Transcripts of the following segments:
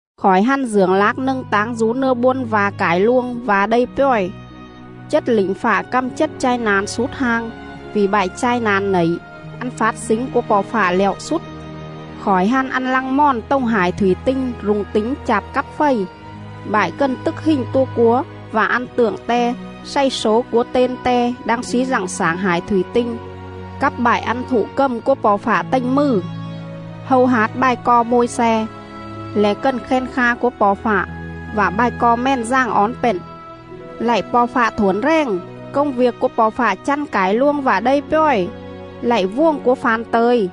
Khỏi hăn dưởng lác nâng táng dú nưa bôn va̱ cải luông, va̱ đây pjòi: Chết lỉnh fạ căm chết chai na̱n slút hang, vỉ bại chai na̱n nẩy, ăn fát slính cúa Po̱ Fạ lẹo slút. Khỏi hăn ăn lăng mòn tồng hải thủy tinh rung tính chạp cắp fầy, bại cần tức hình tua cúa vạ ăn tượng te xày slố cúa ten te đang slí dặng xảng hải thủy tinh, cắp bại ăn thụ cầm cúa Po̱ Fạ tềnh mừ. Hâu hát bài co Môi-xe, le̱ cần khen kha cúa Po̱ Fạ, vạ bài co Mèn Dàng Ón pện:. “Lạy Po̱ Fạ Thuổn Rèng, Công viêc cúa Po̱ Fạ chăn cải luông vạ đây pjòi! Lạy Vuồng cúa fa̱n tơ̱i, Kỉ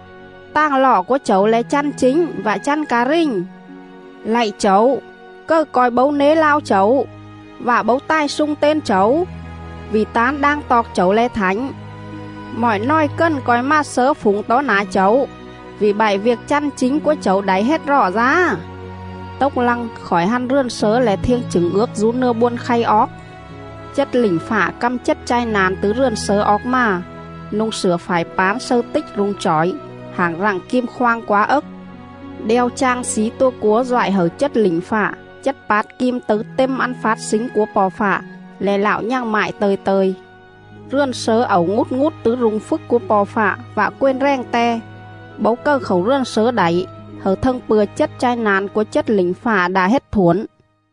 bản hua mai: xiên mường đin. Tàng lọ cúa Chẩu le̱ chăn chính vạ chăn ca rình! Lạy Chẩu, cầư co̱i bấu nế lao Chẩu, Vạ bấu tài slung ten Chẩu? Vỉ tán đang toọc Chẩu le̱ thảnh. Mọi nòi cần co̱i mà Slớ phủng tó nả Chẩu, Vỉ bại viêc chăn chính cúa Chẩu đảy hết rọ dá.”. Tốc lăng, khỏi hăn rườn slớ le̱ Thiêng Chửng Ước dú nưa bôn khay oóc.. Chết lỉnh fạ căm chết chai na̱n tứ rườn slớ oóc mà, nu̱ng slửa phải pán slâư tích rung chỏi, hảng rặng kim khoang quá ấc. Đeo chang slí tua cúa doại hẩư chết lỉnh fạ chết pát kim tấư têm ăn fát slính cúa Po̱ Fạ, le̱ Lạo nhằng mại tơ̱i tơ̱i. Rườn slớ ẩu ngút ngút tứ rung phjức cúa Po̱ Fạ vạ quền rèng Te; bấu cầư khảu rườn slớ đảy hẩư thâng pư̱a chết chai na̱n cúa chết lỉnh fạ đạ hết thuổn..